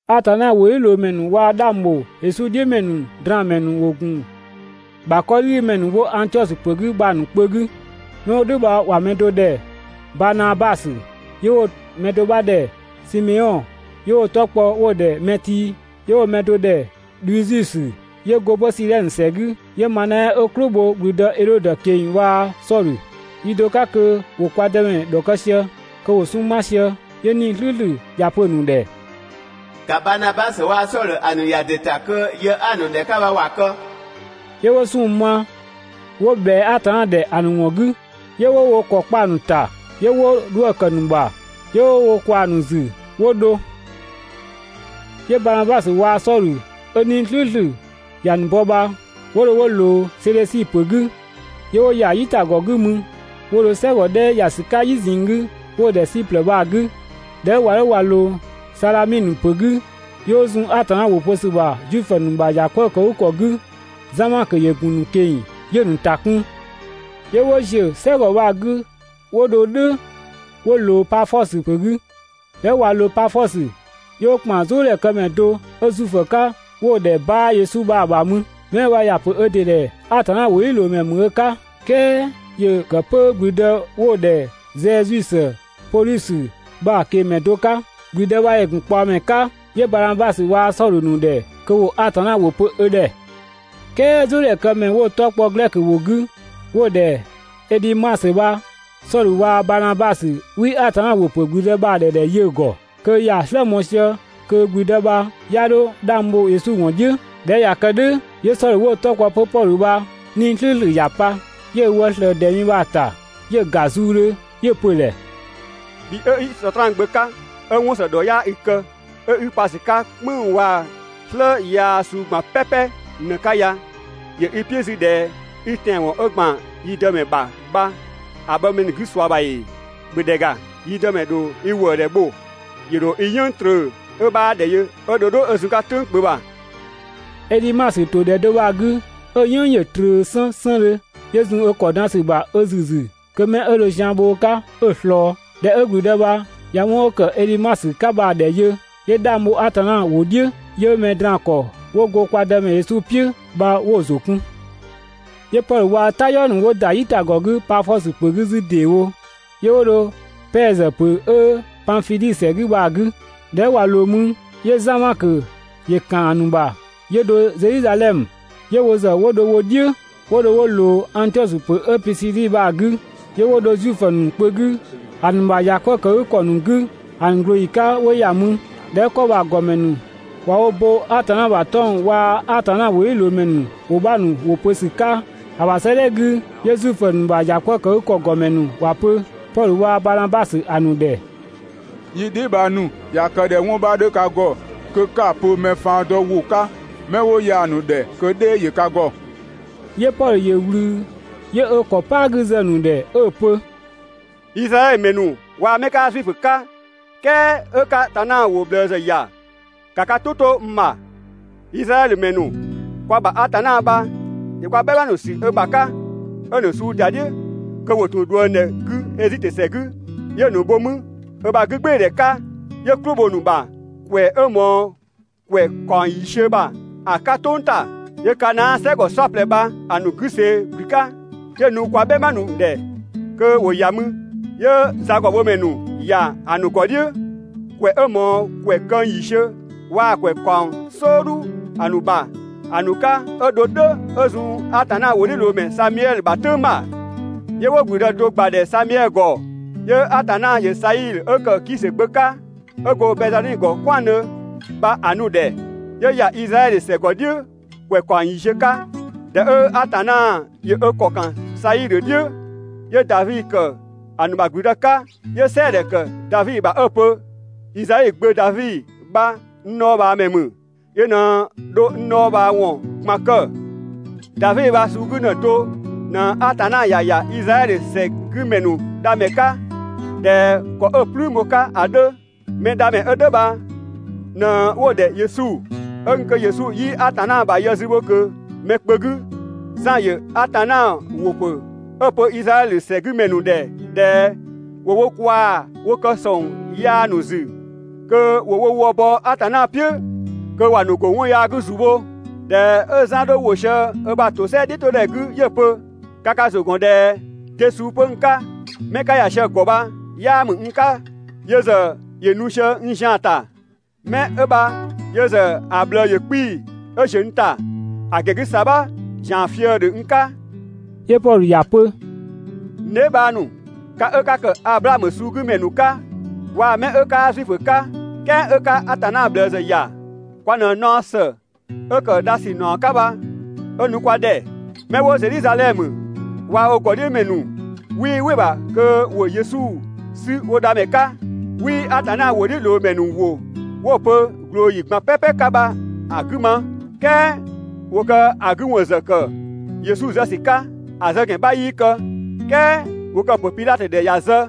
Atanna ‑wʋdhiʋ̈loomɛ ‑nu waa‑ 'dhang ‑bho Yesu "dhiʋ̈ ‑mɛ ‑nu draan‑ ‑mɛ ‑nu ‑wo ‑gun ‑bha 'kɔdhigümɛ ‑nu 'wo Angtiɔsö ‑pö 'gü bha‑ ‑nu kpö 'gü. 'Mɛ 'wo "dhʋ̈ bha ‑wa mɛ do ‑dhɛ Baanabasö, 'yö 'wo‑ mɛ do 'bha ‑dhɛ Simeɔn 'yö 'wo‑ 'tɔ kpɔ 'wo‑ ‑dhɛ Mɛtii, 'yö 'wo‑ mɛ do ‑dhɛ Dhusiusö ('yö go 'pö Sidhɛnö ‑sɛ 'gü), 'yö Manaɛ 'ö "klʋ bho ‑gblüdë Edhodö ꞊keng‑, waa‑ Sɔdhö. Yi do 'ka kö ‑wo kwa Dëmɛ ‑dhɔkë sië, kö ‑wo 'sunng‑ ma sië, 'yö 'Nii‑ "slʋ̈ʋ̈slʋ̈ ‑ya pö‑ ‑nu ‑dhɛ: «‑Ka Baanabasö waa‑ Sɔdhö ‑a ‑nu ‑ya ‑dɩ ‑ta kö yë 'a‑ ‑nu ‑dhɛ 'ka bha ‑wa kë!» 'Yö 'wo 'sunng‑ ma 'wo ꞊bhɛa Atanna ‑dhɛ ‑a ‑nu ‑wɔn 'gü, 'yö 'wo wo ‑kɔ kpa‑ ‑nu ‑ta, 'yö 'wo 'dhuë‑ ‑kë ‑nu ‑bha, 'yö 'wo wo kwaa‑ ‑nu ‑zü 'wo dho. 'Yö Baanabasö waa‑ Sɔdhö 'ö 'Nii‑ "slʋ̈ʋ̈slʋ̈ ‑ya ‑nu bɔ bha, 'wo dho 'wo ꞊loo Sedhösi ‑pö 'gü, 'yö 'wo ‑ya "yitagɔ 'gü mü 'wo dho "sɛgɔ 'dhɛ ‑ya ‑sü 'ka "yi ꞊zinng 'gü 'wo‑ ‑dhɛ Siplë bha‑ 'gü. ꞊Dhɛ 'ö ꞊wa 'dho ꞊wa ꞊loo Sadhaminö ‑pö 'gü, 'yö 'wo zun Atanna ‑wʋ pö ‑sü ‑bha Zuifö ‑nu ‑bha ‑yakwëëkëgükɔ 'gü. Zan Makö ‑yö ‑gun ‑nu ꞊keng‑ 'yö‑ ‑nu ‑ta kun. 'Yö 'wo ‑ziö "sɛgɔ bha‑ 'gü 'wo dho "dhʋ̈ 'wo ꞊loo Pafɔsö ‑pö 'gü. ꞊Dhɛ 'ö ꞊wa ꞊loo Pafɔsö, 'yö 'wo ‑kpan "zʋʋdhɛ këmɛ do 'ö Zuifö 'ka 'wo‑ ‑dhɛ Baa Yesu bha‑ ‑bha mü. 'Mɛ 'ö bha ‑ya ‑pö ö ‑dɩ ‑dhɛ Atanna ‑wʋdhiʋ̈loomɛ ‑mü ö 'ka, "kɛɛ ‑yö ‑kë 'pö ‑gblüdë 'wo‑ ‑dhɛ Sɛɛziusö Podhusö bha‑ ꞊kengmɛ do 'ka. ‑Gblüdë bha ‑yö ‑gun ꞊kpaɔmɛ 'ka, 'yö Baanabasö waa‑ Sɔdhö ‑nu ‑dhɛ kö ‑wo Atanna ‑wʋ pö ö ‑dhɛ. "Kɛɛ "zʋʋdhɛ këmɛ 'wo‑ 'tɔ kpɔ glɛkö ‑wʋ 'gü 'wo‑ ‑dhɛ Edhimasö bha, Sɔdhö waa‑ Baanabasö 'wii Atanna ‑wʋ ‑pö ‑gblüdë bha‑ ‑dhɛ ‑dhɛ 'yö‑ ‑gɔ, kö ‑ya "slë mɔɔ‑ sië kö ‑gblüdë bha 'ya 'dho 'dhang bho Yesu ‑wɔn "dhiʋ̈. ꞊Dhɛ 'ö ꞊ya kë "dhʋ̈, 'yö Sɔdhö 'wo‑ 'tɔ kpɔ 'pö Pɔdhö bha 'Nii‑ "slʋ̈ʋ̈slʋ̈ ‑ya pa, 'yö ö wë ꞊slëë ‑dɛ mi bha‑ ‑ta 'yö‑ ‑ga zuudhö 'yö‑ pö‑ ‑dhɛ: «Bhi 'ö 'i Sɔtraan gbö 'ka 'ö 'wɔn ‑së ‑dhɔ 'yaa i kë, 'ö 'i pa ‑sü 'ka "kpënng‑ waa‑ "slë yaa suu ꞊gban "pɛpɛ ꞊në‑ 'ka ya, ‑yö i "piʋ̈ 'zü ꞊dhɛ 'i tɛanwɔn 'ö ‑gban yi Dëmɛ ‑bha bha‑ bhɔ mɛ ‑nu 'gü ꞊sua ‑bha ‑ee? ‑Bhö ‑dhɛ ‑ga, yi Dëmɛ ‑dho i ‑wëëdhɛ bho, ‑yö ‑dho i "yënng trö 'ö 'bhaa ‑dhɛ yö 'ö dho 'ö zun‑ 'ka "tʋ̈ng kpö ‑bha!» Edhimasö ‑to ‑dhɛ do bha‑ 'gü 'ö‑ "yënng ‑yö ꞊tröö 'sënsëndhö, 'yö zun ö ‑kɔ dan ‑sü ‑bha ö ‑züzü kö 'mɛ 'ö dho zian bho ö 'ka 'ö‑ ꞊slɔɔ. ꞊Dhɛ 'ö ‑gblüdë bha ꞊ya 'wɔn 'ö ‑kë Edhimasö 'ka bha‑ ‑dhɛ yö, 'yö 'dhang bho Atanna ‑wʋ "dhiʋ̈, 'yö mɛ draan‑ ‑kɔ ‑nu 'wo go kwa Dëmɛ Yesu "piʋ̈ bha 'wo‑ ‑zʋ kun. 'Yö Pɔdhö waa‑ ö "tayɔɔ ‑nu ‑wo ‑da "yitagɔ 'gü Pafɔsö ‑pö 'gü 'zü ‑deewo, 'yö 'wo dho Pɛɛzö ‑pö 'ö Panfidhi ‑sɛ 'gü bha‑ 'gü. ꞊Dhɛ 'ö ꞊wa ꞊loo mü, 'yö Zan Makö ‑yö ‑kan ‑a ‑nu ‑bha 'yö dho Zedhizadhɛmö. 'Yö wo ‑zë 'wo dho wo "dhiʋ̈ 'wo dho 'wo ꞊loo Angtiɔsö ‑pö 'ö Pisidi bha‑ 'gü, 'yö 'wo dho Zuifö ‑nu kpö 'gü ‑a ‑nu ‑bha ‑yakwëëkëgükɔ ‑nu 'gü ‑a ‑nu ꞊glooyi 'ka 'wo ‑ya mü. ꞊Dhɛ 'ö 'kɔ bha‑ ‑gɔmɛ ‑nu ꞊wa wo bo Atanna ‑bha 'tɔng‑ ‑nu waa‑ Atanna ‑wʋdhiʋ̈loomɛ ‑nu ‑wʋ 'bha ‑nu ‑wʋ pö ‑sü 'ka‑ ‑bha 'sëëdhɛ 'gü, 'yö Zuifö ‑nu ‑bha ‑yakwëëkëgükɔ ‑gɔmɛ ‑nu ‑wa pö Pɔdhö waa‑ Baanabasö ‑a ‑nu ‑dhɛ: «Yi dheebhang ‑nu, ꞊ya kë ꞊dhɛ 'wɔn 'bha 'dhö ka ‑gɔ kö 'ka‑ pö mɛ faan dɔ ‑wʋ 'ka 'mɛ 'wo ya‑ ‑nu ‑dhɛ kö "dhɛɛ ‑yö ka ‑gɔ.» 'Yö Pɔdhö ‑yö ꞊wlü 'yö ö ‑kɔ "paa 'gü zë‑ ‑nu ‑dhɛ 'ö‑ pö: «Izraɛdhö ‑mɛ ‑nu waa‑ 'mɛ 'kaa Zuifö 'ka, "kɛɛ 'ö 'ka Atanna ‑wʋ ꞊bhlëë ‑zë ‑ya, ‑ka ka "tʋ 'to n ‑bha! Izraɛdhö ‑mɛ ‑nu, kwa ‑bha Atanna bha ‑yö kwa "bhɛma ‑nu sü ö ‑bha 'ka 'ö‑ ‑nu suu ‑da "dhiʋ̈ kö ‑wo ‑tun ꞊dhuëngdhɛ 'gü Ezitö ‑sɛ 'gü, 'yö‑ ‑nu bho mü ö ‑bha 'gügbɩɩdhɛ 'ka, 'yö "klʋ bho‑ ‑nu ‑bha ‑kwɛ 'ö ꞊mɔɔ ‑kwɛ ‑kaɔng ‑yiisiö ‑bha ‑a 'ka "tʋng ‑ta. 'Yö Kanaa "sɛgɔ "saɔplɛ bha‑ ‑nu 'gü ꞊see ‑gblü 'ka, 'yö‑ nu kwa "bhɛma ‑nu ‑dhɛ kö ‑wo ‑ya mü. 'Yö zagɔbhomɛ ‑nu ‑ya ‑nu ‑gɔ "dhiʋ̈ ‑kwɛ 'ö ꞊mɔɔ ‑kwɛ këng ‑yiisiö waa‑ ‑kwɛ ‑kaɔng "sɔɔdhu ‑nu ‑bha ‑a 'ka 'ö dho "dhʋ̈ 'ö zun Atanna ‑wʋdhiʋ̈loomɛ Samiɛdhö ‑bha "tʋ̈ng ‑bha. 'Yö 'wo ‑gblüdë do ‑gbadhɛ Samiɛdhö ‑gɔ, 'yö Atanna ‑yö Saidhö 'ö ‑kë Kisö gbö 'ka, 'ö go Bɛnngzamɛ ‑gɔ "kwɛandhö bha‑ nu‑ ‑nu ‑dhɛ, 'yö ‑ya Izraɛdhö ‑sɛ ‑gɔ "dhiʋ̈ ‑kwɛ ‑kaɔng ‑yiisiö 'ka. ꞊Dhɛ 'ö Atanna ‑yö ö ‑kɔ ‑kan Saidhö "dhiʋ̈, 'yö Davi ‑kë ‑nu ‑bha ‑gblüdë 'ka, 'yö "sɛɛdhɛ kë Davi ‑bha 'ö‑ pö: ‹Izai gbö Davi bha n dhɔɔbhaamɛ ‑mü, yö ꞊në dho n dhɔɔbhaawɔn ꞊gban kë›. Davi bha‑ suu 'gü ‑në do ꞊në Atanna ‑ya ‑ya Izraɛdhö ‑sɛ 'gü ‑mɛ ‑nu Dhamɛ 'ka ꞊dhɛ ‑kɔ 'ö‑ "plüün bho‑ 'ka ‑a 'dhö. Mɛdhamɛ 'ö "dhʋ̈ bha ꞊në 'wo‑ ‑dhɛ Yesu. 'Ö gun kö Yesu 'yii Atanna ‑bha yë zü bho ꞊kö mɛ kpö 'gü, Zan ‑yö Atanna ‑wʋ ‑pö 'ö‑ pö Izraɛdhö ‑sɛgümɛ ‑nu ‑dhɛ ꞊dhɛ ‑wo wo kwaa‑ wo ‑kë ‑sɔng yaa ‑nu ‑zü kö ‑wo wo wë bɔ Atanna "piʋ̈ kö ‑wa ‑nu ‑bɔ ‑a 'ka ‑zu bho. ꞊Dhɛ 'ö Zan 'dhö ‑wo sië ö ‑bha ‑tosɛa "dhiʋ̈todhɛ 'gü 'yö‑ pö: «Ka ka ‑zʋ ‑gɔn ꞊dhɛ de suu 'pö n 'ka? 'Mɛ 'ka ‑ya sië‑ ‑gɔ bha 'yaa ‑mü n 'ka, yö ‑zë ‑yö nu sië n zian‑ ‑ta. Mɛ 'ö bha yö ‑zë ꞊bhlëë ‑yö 'kpii‑ 'ö ‑ziö n ‑ta, ‑a ‑gɛn 'gü ‑sabha ‑zian fië‑ ‑dhö n 'ka.» 'Yö Pɔdhö ‑ya pö: «N dheebhang ‑nu, ka 'ö 'ka ‑kë Ablaamö suugümɛ ‑nu 'ka, waa‑ 'mɛ 'ö 'kaa Zuifö 'ka "kɛɛ 'ö 'ka Atanna ꞊bhlëë ‑zë ‑ya, kwa ꞊në naɔ ‑së 'ö ‑kë dha ‑sü ‑naɔ 'ka bha 'ö nu kwa ‑dhɛ. 'Mɛ 'wo Zedhizadhɛmö waa‑ wo ‑gɔdhiʋ̈mɛ ‑nu 'wii "wɩ‑ ‑bha kö ‑wo Yesu 'sü wo Dhamɛ 'ka, 'wii Atanna ‑wʋdhiʋ̈loomɛ ‑nu ‑wʋ 'wo‑ pö ꞊glooyi ꞊gban "pɛpɛ 'ka bha‑ 'gü ma, "kɛɛ ‑wo kë‑ 'gü ‑wɔn ‑zë ‑kë Yesu zë ‑sü 'ka. ‑A zë ‑gɛn 'bha 'yii kë, "kɛɛ ‑wo kë‑ ‑pö Pidhatö ‑dhɛ ‑ya zë.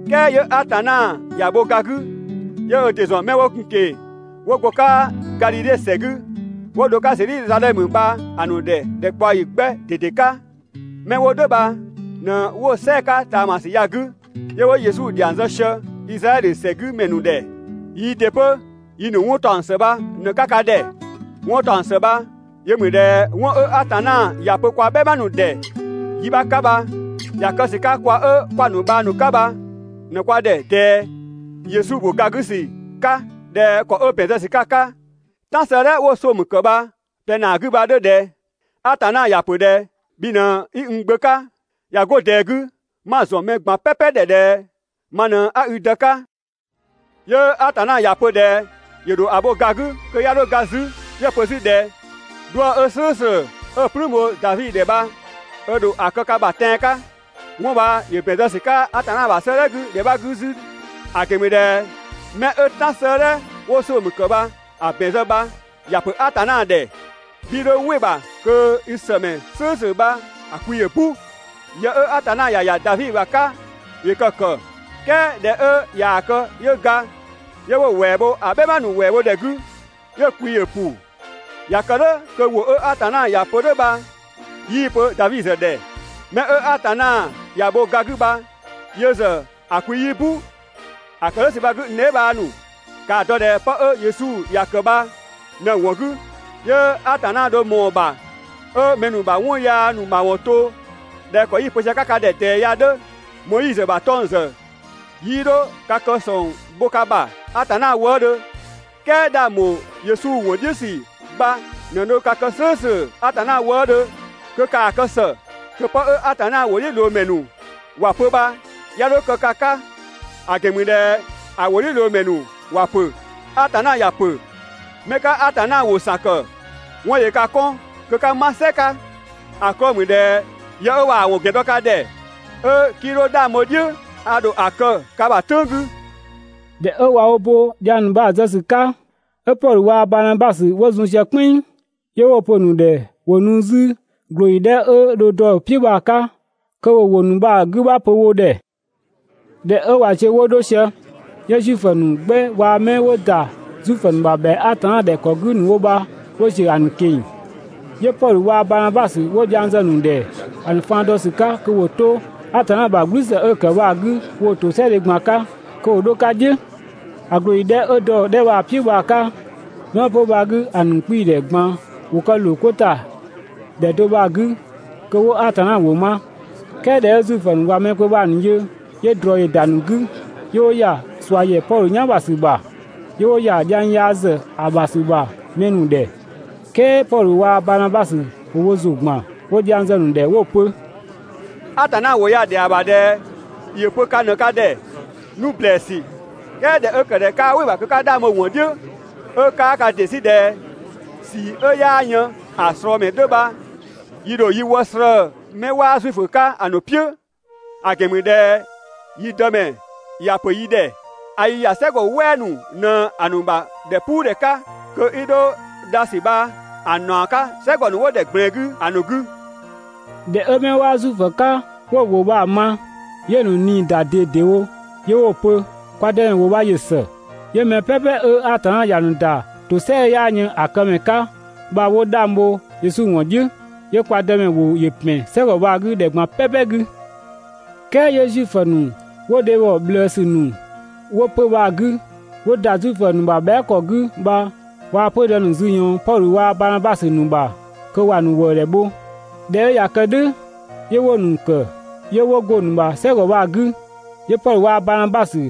"Kɛɛ 'yö Atanna ‑ya bho ga 'gü, 'yö ö ‑dɩ ‑zɔn 'mɛ 'wo gun‑ ꞊keng‑ 'wo go‑ 'ka Gadhidhe ‑sɛ 'gü 'wo dho‑ 'ka Zedhizadhɛmö bha‑ ‑nu ‑dhɛ ‑dhɛkpaɔyi 'gbɛ ꞊dede 'ka, 'mɛ 'wo "dhʋ̈ bha ꞊në 'wo‑ "sɛɛ‑ 'ka ꞊taamasü ya‑ 'gü, 'yö 'wo Yesu ‑dhiang zë sië Izraɛdhö ‑sɛgümɛ ‑nu ‑dhɛ. Yii ‑dɩ 'pö yi ‑nu 'wɔn ‑taɔng ‑së bha ꞊në‑ 'ka ka ‑dhɛ. 'Wɔn ‑taɔng ‑së bha yö ‑mü ꞊dhɛ 'wɔn 'ö Atanna ‑ya pö kwa "bhɛma ‑nu ‑dhɛ yi 'bha 'ka bha, ‑ya kë ‑sü 'ka kwa 'ö 'kwa‑ ‑nu bhang ‑nu 'ka bha ꞊në kwa ‑dhɛ ꞊dɛɛ Yesu ‑bho ga 'gü ‑sü 'ka ‑dhɛ ‑kɔ 'ö ‑bɛn zë ‑sü 'ka‑ 'ka "Tan 'sëëdhɛ ('wo‑ Somö ‑kë bha‑) ꞊plɛ ‑naa 'gü bha‑ 'dhö ꞊dhɛ: ‹Atanna ‑ya ‑pö ꞊dhɛ: Bhi ꞊në 'i n Gbö 'ka, ꞊ya 'go ꞊dɛɛ 'gü 'ma‑ ‑zɔn mɛ ꞊gban ‑dhɛ ꞊dhɛ ma ꞊në 'a i Dë 'ka›. 'Yö Atanna ‑ya pö ꞊dhɛ ‑yö ‑dho ‑a bho ga 'gü kö 'ya 'dho ga 'zü. 'Yö‑ pö 'zü ꞊dhɛ: ‹'Dhuë‑ 'ö "slʋ̈ʋ̈slʋ̈ 'ö‑ "plüün bho Davi ‑dhɛ bha ö ‑dho ‑a kë ka ‑bha tɛan‑ 'ka›. 'Wɔn bha ‑yö ‑bɛn zë ‑sü 'ka Atanna ‑bha 'sëëdhɛ 'gü ‑dhɛ 'bha 'gü 'zü, ‑a ‑gɛn ‑mü ꞊dhɛ 'mɛ 'ö "Tan 'sëëdhɛ ('wo‑ Somö ‑kë bha‑) ‑bɛn zë bha ‑ya ‑pö Atanna ‑dhɛ: ‹'Bhii 'dho "wɩ‑ ‑bha kö i ‑sëmɛ "slʋ̈ʋ̈slʋ̈ bha‑ kwi ‑yö "bu›. Yë 'ö Atanna ‑ya ‑ya Davi ‑bha 'ka ‑yö kë‑ ‑kë, "kɛɛ ꞊dhɛ 'ö ꞊yaa‑ kë 'yö ga, 'yö 'wo‑ ‑wɛɛ bho ‑a "bhɛma ‑nu ‑wɛɛ bho ‑dhɛ 'gü, 'yö‑ kwi ‑yö ‑bu. (꞊Ya kë "dhʋ̈ kö ‑wʋ 'ö Atanna ‑ya pö "dhʋ̈ bha 'yii‑ pö Davi ‑zë ‑dhɛ.) Mɛ 'ö Atanna ‑ya bho ga 'gü bha yö ‑zë kwi 'yii "bu. ‑A ‑kë "dhʋ̈ ‑sü bha‑ 'gü n dheebhang ‑nu, ‑kaa dɔ ꞊dhɛ pë 'ö Yesu ‑ya ‑kë bha ꞊në‑ ‑wɔn 'gü 'yö Atanna dho ꞊mɔɔ‑ ‑bha 'ö mɛ ‑nu ‑bha 'wɔn yaa ‑nu ‑mawɔn to ꞊dhɛ ‑kɔ 'yi‑ pö sië‑ 'ka ka ‑dhɛ ꞊dɛɛ ya‑ 'dhö. Moizö ‑bha 'tɔng‑ ‑zë 'yii 'dho ka kë ‑sɔng bho ka ‑bha Atanna wëëdhö, "kɛɛ 'dhang ‑bho Yesu ‑wɔn "dhiʋ̈ ‑sü bha ꞊në dho ka kë "slʋ̈ʋ̈slʋ̈ Atanna wëëdhö. Kö ‑kaa kë ‑së kö 'pë 'ö Atanna ‑wʋdhiʋ̈loomɛ ‑nu ‑wa pö bha 'ya 'dho kë ka 'ka; ‑a ‑gɛn ‑mü ꞊dhɛ ‑a ‑wʋdhiʋ̈loomɛ ‑nu ‑wa ‑pö: ‹Atanna ‑ya pö: 'Mɛ 'ka Atanna ‑wʋ ‑san ‑kë, 'wɔn ‑yö ka 'kɔn kö 'ka 'ma "sɛ 'ka, ‑a 'klɔɔ‑ ‑mü ꞊dhɛ yë 'ö ꞊waa‑ ‑wɔn ‑gɛn dɔ ka ‑dhɛ, 'ö 'kii 'dho 'dhang bho‑ "dhiʋ̈, a ‑dho ‑a kë ka ‑bha "tʋ̈ng 'gü›.» ꞊Dhɛ 'ö ꞊wa bo dhiang ‑nu bha‑ ‑nu zë ‑sü 'ka, 'ö Pɔdhö waa‑ Baanabasö 'wo zun sië "kpɛnng, 'yö 'wo‑ pö‑ ‑nu ‑dhɛ ‑wo nu 'zü ꞊glooyi 'dhɛ 'ö dho dɔ‑ "piʋ̈ bha‑ 'ka kö ‑wo ‑wʋ ‑nu bha‑ 'gü 'bha pö wo ‑dhɛ. ꞊Dhɛ 'ö ꞊wa ziö 'wo 'dho sië, 'yö Zuifö ‑nu 'gbɛ waa‑ 'mɛ 'wo ‑da Zuifö ‑nu ‑bha ‑bhɛa Atanna ‑dhɛ ‑kɔ 'gü ‑nu wo bha 'wo ‑ziö ‑a ‑nu ꞊keng‑. 'Yö Pɔdhö waa‑ Baanabasö 'wo dhiang ‑nu zë‑ ‑nu ‑dhɛ ‑a ‑nu faan dɔ ‑sü 'ka kö ‑wo 'to Atanna ‑bha "gblüsë 'ö‑ ‑kë bha‑ 'gü woo‑ ‑tosɛadhe ꞊gban 'ka kö ‑wo 'dho‑ 'ka "dhiʋ̈. ‑A ꞊glooyi 'dhɛ 'ö dɔ‑ 'dhɛ bha‑ "piʋ̈ bha‑ 'ka, 'mɛ 'wo 'pö‑ bha‑ 'gü, ‑a ‑nu 'kpii‑ ‑dhɛ ꞊gban ‑wo kë ‑loo 'ko ‑ta ‑dhɛ do bha‑ 'gü kö 'wo Atanna ‑wʋ ma. "Kɛɛ ꞊dhɛ 'ö Zuifö ‑nu ꞊wa mɛ kpö bha‑ ‑nu yö, 'yö ꞊drɔ ‑yö ‑da ‑nu 'gü 'yö 'wo ‑ya ꞊sua ‑yɛ Pɔdhö "yan ‑bha ‑sü ‑bha. 'Yö 'wo ‑ya ‑dhiang yaa ‑zë ‑a ‑bha ‑sü ‑bha mɛ ‑nu ‑dhɛ. "Kɛɛ Pɔdhö waa‑ Baanabasö ‑wo wo ‑zʋ ‑gban 'wo dhiang zë‑ ‑nu ‑dhɛ 'wo‑ pö: «Atanna ‑wʋ ya‑ ‑dhɛa ‑bha ꞊dhɛ ‑yö pö ka ꞊në ka ‑dhɛ nu ‑blɛɛsü, "kɛɛ ꞊dhɛ 'ö ‑kë ꞊dhɛ 'kaa "wɩ‑ ‑bha kö 'ka 'dhang bho‑ ‑wɔn "dhiʋ̈, 'ö 'kaa ka ‑dɩ 'sü ꞊dhɛ ꞊sii 'ö 'yaa yën ‑a ꞊slɔɔ ‑mɛ 'dhö bha yi ‑dho yi wë slëë‑ 'mɛ 'waa Zuifö 'ka‑ ‑nu "piʋ̈. ‑a ‑gɛn ‑mü ꞊dhɛ yi Dëmɛ ‑ya ‑pö yi ‑dhɛ: «A i ‑ya "sɛgɔ "wɛɛ ‑nu ꞊në‑ ‑nu ‑bha ‑dhɛpuudhɛ 'ka kö 'i 'dho dha ‑sü bha‑ ‑naɔ 'ka "sɛgɔ ‑nu 'wo ‑dhɛ ꞊gblɛɛn 'gü ‑a ‑nu 'gü. ꞊Dhɛ 'ö 'mɛ 'waa Zuifö 'ka 'wo‑ ‑nu ‑wʋ bha‑ ma, 'yö‑ ‑nu ꞊nii ‑da ꞊dedewo 'yö 'wo‑ pö: «Kwa Dëmɛ ‑wʋ bha ‑yö ‑së!» 'Yö mɛ "pɛpɛ 'ö Atanna ‑ya ‑nu ‑da ‑tosɛa 'ö 'yaa yën ‑a këmɛ 'ka bha 'wo 'dhang bho Yesu ‑wɔn "dhiʋ̈. 'Yö kwa Dëmɛ ‑wʋ ‑yö ‑pɛn "sɛgɔ bha‑ 'gü ‑dhɛ ꞊gban "pɛpɛ 'gü. "Kɛɛ 'yö Zuifö ‑nu 'wo dhebhɔ ꞊bhlëësü ‑nu 'wo 'pö‑ bha‑ 'gü, 'wo ‑da Zuifö ‑nu ‑bha bhɛa" ‑kɔ 'gü bha waa‑ 'pödë ‑nu zü ꞊yɔɔn Pɔdhö waa‑ Baanabasö ‑nu ‑bha kö ‑wa ‑nu ‑wëëdhɛ bho. ꞊Dhɛ 'ö ꞊ya kë "dhʋ̈ 'yö 'wo‑ ‑nu ‑kë, 'yö 'wo go‑ ‑nu ‑bha "sɛgɔ bha‑ 'gü. 'Yö Pɔdhö waa‑ Baanabasö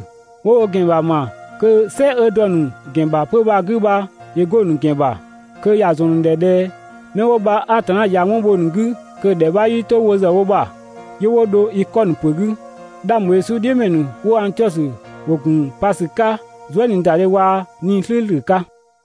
'wo wo ‑gɛn ‑bha ‑ma kö "sɛ 'ö dɔ‑ ‑nu ‑gɛn ‑bha 'pö‑ bha‑ 'gü bha ‑yö 'go‑ ‑nu ‑gɛn ‑bha kö ‑wa ‑zɔn ‑nu ‑dhɛ ꞊dhɛ ('mɛ 'wo bha Atanna ꞊ya 'wɔn bho‑ ‑nu 'gü kö‑) ‑dhɛ 'bha 'yii 'to wo ‑zë wo ‑bha, 'yö 'wo dho Ikɔnö ‑pö 'gü. 'Dhang ‑bho Yesu "dhiʋ̈ ‑mɛ ‑nu 'wo Angtiɔsö ‑wo ‑gun pa ‑sü 'ka zuëniidadhe waa‑ 'Nii‑ "slʋ̈ʋ̈slʋ̈ 'ka.